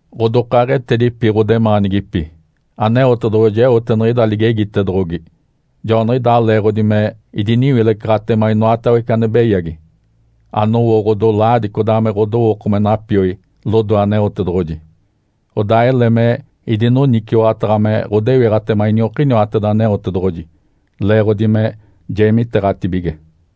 Ǥodokaaɡ̶etedipi ɡ̶odemaanigipi, Aneotedoɡ̶oji eote niɡ̶ida ligegitedoɡ̶ogi. Joaniɡ̶idaa leeɡ̶odi me idiniwilecaɡ̶atema inoatawece ane beyagi, anowo ɡ̶odolaadi codaa me ɡ̶odowooko me napioi lodoe Aneotedoɡ̶oji. Odaa ele me idinoniciwaɡ̶ataɡ̶a me ɡ̶odewiɡ̶atema iniokiniwateda Aneotedoɡ̶oji leeɡ̶odi me jeemiteeɡ̶atibige.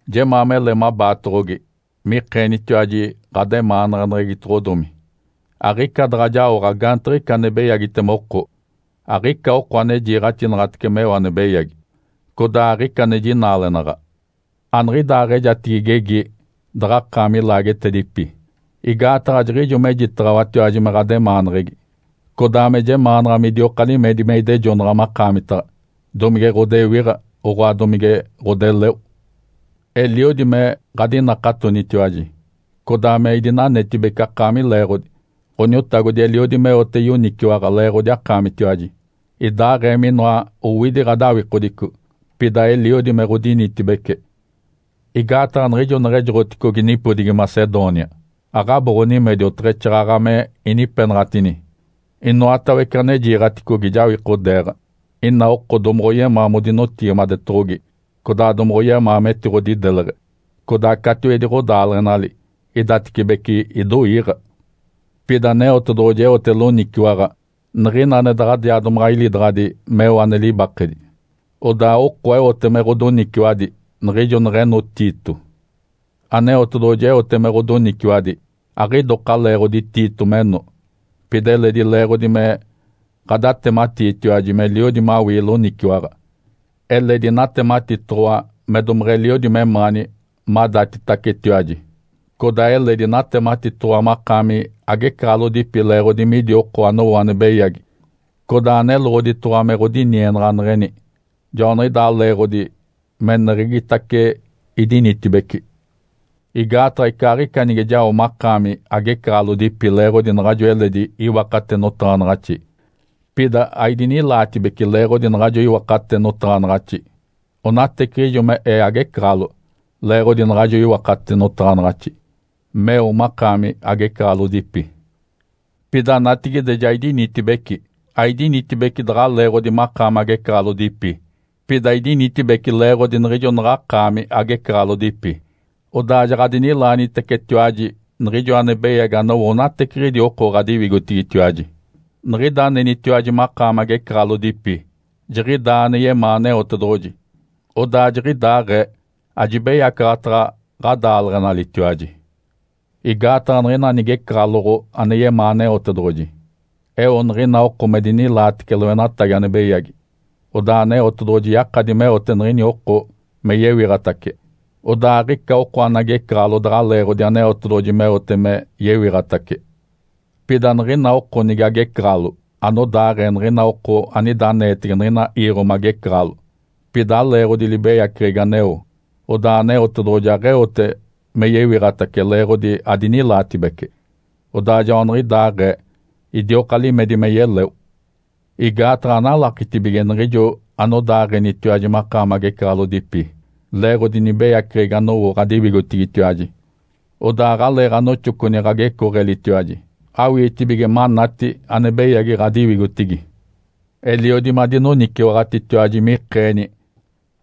Jemaa mele mabaatoɡ̶ogi mikeenitiwaji ɡ̶ademaanaɡ̶aneɡ̶egitoɡ̶odomi. Aɡ̶ica daɡ̶a jaoɡ̶a gaantiɡ̶ica ane beyagitema oko. Aɡ̶ica oko ane jiiɡ̶axinaɡ̶atece meo ane beyagi. Codaa aɡ̶ica ane jinaalenaɡ̶a. Aniɡ̶idaaɡ̶ejatigi igegi daɡ̶akaami ilaagetedipi, igaataɡ̶a jiɡ̶ijo mejitaɡ̶awatiwaji me ɡ̶ademaaneɡ̶egi, codaa me jemaanaɡ̶a midioka limedi me idejonaɡ̶a makaamitaɡ̶a, domige ɡ̶odewiɡ̶a, oɡ̶oa, domige ɡ̶odeleo. Eliodi me ɡ̶adinakatonitiwaji, codaa me idinanetibece akaami leeɡ̶odi. Ǥoniotagodi eliodi meote yoniciwaɡ̶a leeɡ̶odi akaamitiwaji. Idaaɡ̶ee minoa owidi ɡ̶odawikodico, pida eliodi me ɡ̶odinitibece. Igaataɡ̶a niɡ̶ijo neɡ̶ejoɡ̶oticogi nipodigi Macedônia, aɡ̶abo ɡ̶onimedi oteɡ̶exaaɡ̶aɡ̶a me inipeneɡ̶enaɡ̶atini. Inoatawece ane jiiɡ̶aticogi jawikodeeɡ̶a. Ina oko domoɡ̶oyemaa modinotigimadetoɡ̶ogi codaa domoɡ̶oyemaa metiɡ̶odideleɡ̶e. Codaa catiwedi ɡ̶odaaleɡ̶enali idatecibece idoiiɡ̶a. Pida Aneotedoɡ̶oji eote loniciwaɡ̶a niɡ̶ina ane daɡ̶adiaa domaɡ̶a ilidaɡ̶adi meo ane libakedi. Odaa oko eote me ɡ̶odoniciwadi niɡ̶ijo neɡ̶eno Tito. Aneotedoɡ̶oji eote me ɡ̶odoniciwadi aɡ̶idoka leeɡ̶odi Tito meno, pida eledi leeɡ̶odi me ɡ̶adatematiitiwaji meliodi mawii loniciwaɡ̶a. Eledi natematitoɡ̶owa me domeɡ̶eliodi memaani madatitacetiwaji, codaa eledi natematitoɡ̶owa makaami agecaɡ̶alodipi leeɡ̶odi midi oko anowo ane beyagi, codaa neloɡ̶oditoɡ̶owa me ɡ̶odinienaɡ̶aneɡ̶eni. Joaniɡ̶idaa leeɡ̶odi meneɡ̶egitace idinitibeci. Igaataɡ̶a, icaaɡ̶ica nige jao makaami agecaɡ̶alodipi leeɡ̶odi naɡ̶ajo eledi iwakate notaɡ̶anaɡ̶axi, pida aidinilaatibece leeɡ̶odi naɡ̶ajo iwakate notaɡ̶anaɡ̶axi. Onateciɡ̶ijo me ee agecaɡ̶alo leeɡ̶odi naɡ̶ajo iwakate notaɡ̶anaɡ̶axi meo makaami agecaɡ̶alodipi. Pida natigide ja idinitibeci. Aidinitibeci daɡ̶a leeɡ̶odi makaami agecaɡ̶alodipi, pida idinitibeci leeɡ̶odi niɡ̶ijo naɡ̶akaami agecaɡ̶alodipi, odaa jaɡ̶adinilaanitecetiwaji niɡ̶ijo ane beyagi anowo onateciɡ̶idi oko ɡ̶adiwigotigitiwaji. Niɡ̶ida anenitiwaji makaami agecaɡ̶alodipi, jiɡ̶idaa ane yemaa Aneotedoɡ̶oji. Odaa jiɡ̶idaaɡ̶ee ajibeyacaɡ̶ataɡ̶a ɡ̶adaaleɡ̶enalitiwaji. Igaataɡ̶a niɡ̶ina nigecaɡ̶aloɡ̶o ane yemaa Aneotedoɡ̶oji, eo niɡ̶ina oko me dinilaatece loenatagi ane beyagi. Odaa Aneotedoɡ̶oji yakadi meote niɡ̶ini oko me yewiɡ̶atace, odaa aɡ̶ica oko ane agecaɡ̶alo daɡ̶a leeɡ̶odi Aneotedoɡ̶oji meote me yewiɡ̶atace. Pida niɡ̶ina oko nige agecaɡ̶alo anodaaɡ̶ee niɡ̶ina oko anida aneetege niɡ̶ina iiɡ̶o magecaɡ̶alo, pida aleeɡ̶odi libeyaceɡ̶egi aneo, odaa Aneotedoɡ̶oji aɡ̶eote me yewiɡ̶atace leeɡ̶odi adinilaatibece. Odaa joaniɡ̶idaaɡ̶ee idioka limedi me yeleo. Igaataɡ̶a analakitibige niɡ̶ijo anodaaɡ̶enitiwaji makaami agecaɡ̶alodipi leeɡ̶odi nibeyaceɡ̶egi anowo ɡ̶adiwigotigitiwaji. Odaa aɡ̶aleeɡ̶anoxoconi ɡ̶agecooɡ̶elitiwaji awiitibige manati ane beyagi ɡ̶adiwigotigi. Eliodi madinoniciwaɡ̶atitiwaji mikeeni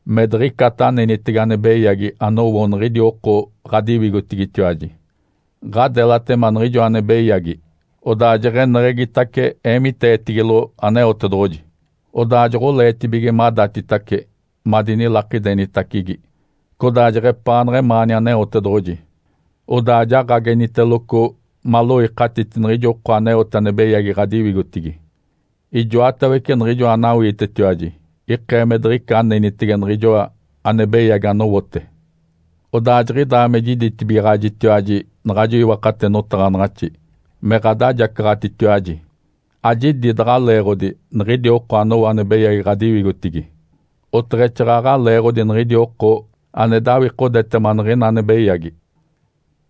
me diɡ̶icata anenitege ane beyagi anowo niɡ̶idi oko ɡ̶adiwigotigitiwaji. Ǥadelatema niɡ̶ijo ane beyagi, odaa jeɡ̶eneɡ̶egitace eemiteetigilo Aneotedoɡ̶oji. Odaa joɡ̶oleetibige madatitace madinilakidenitacigi, codaa jeɡ̶epaanaɡ̶a emaani Aneotedoɡ̶oji. Odaa jaɡ̶ageniteloco maloikatiti niɡ̶ijo oko aneote ane beyagi ɡ̶adiwigotigi. Ijoatawece niɡ̶ijoa anawiitetiwaji ikee me diɡ̶ica anenitege niɡ̶ijoa ane beyagi anowote. Odaa jiɡ̶idaa me jiditibigaɡ̶ajitiwaji naɡ̶ajo iwakate notaɡ̶anaɡ̶axi me ɡ̶adajacaɡ̶atitiwaji, ajidi daɡ̶a leeɡ̶odi niɡ̶idi oko anowo ane beyagi ɡ̶adiwigotigi, oteɡ̶exaaɡ̶aɡ̶a leeɡ̶odi niɡ̶idi oko ane dawikodetema niɡ̶ina ane beyagi.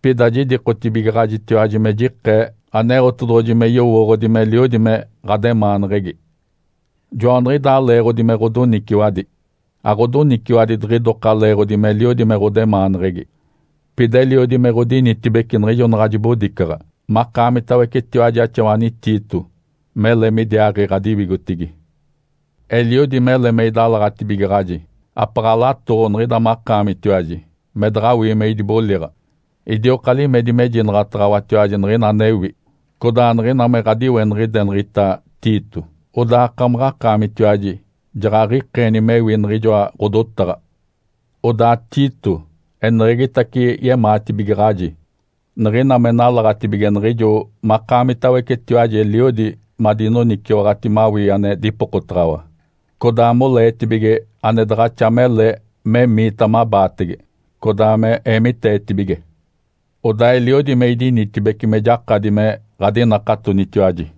Pida jidikotibigaɡ̶ajitiwaji me jikee Aneotedoɡ̶oji me yowooɡ̶odi meliodi me ɡ̶ademaaneɡ̶egi. Joaniɡ̶idaa leeɡ̶odi me ɡ̶odoniciwadi. Aɡ̶odoniciwadi diɡ̶idoka leeɡ̶odi meliodi me ɡ̶odemaaneɡ̶egi, pida eliodi me ɡ̶odinitibece niɡ̶ijo naɡ̶a jibodicaɡ̶a makaamitawecetiwaji axawani Tito mele midiaaɡ̶i ɡ̶adiwigotigi. Eliodi mele me idalaɡ̶atibigaɡ̶aji, apaɡ̶alatoɡ̶o niɡ̶ida makaamitiwaji me daɡ̶awii me idiboliɡ̶a. Idioka limedi mejinaɡ̶ataɡ̶awatiwaji niɡ̶ina anewi, codaa niɡ̶ina me ɡ̶adiweniɡ̶ideneɡ̶egita Tito, odaa akamaɡ̶akaamitiwaji jaɡ̶aɡ̶ikeeni mewi niɡ̶ijoa ɡ̶odotaɡ̶ata. Odaa Tito eneɡ̶egitace yemaatibigaɡ̶aji niɡ̶ina me nalaɡ̶atibige niɡ̶ijo makaamitawecetiwaji eliodi madinoniciwaɡ̶ati mawii ane dipokotaɡ̶awa, codaa moleetibige ane daɡ̶axa mele memiita mabaatege, codaa me eemiteetibige. Odaa eliodi me idinitibeci me jakadi me ɡ̶adinakatonitiwaji.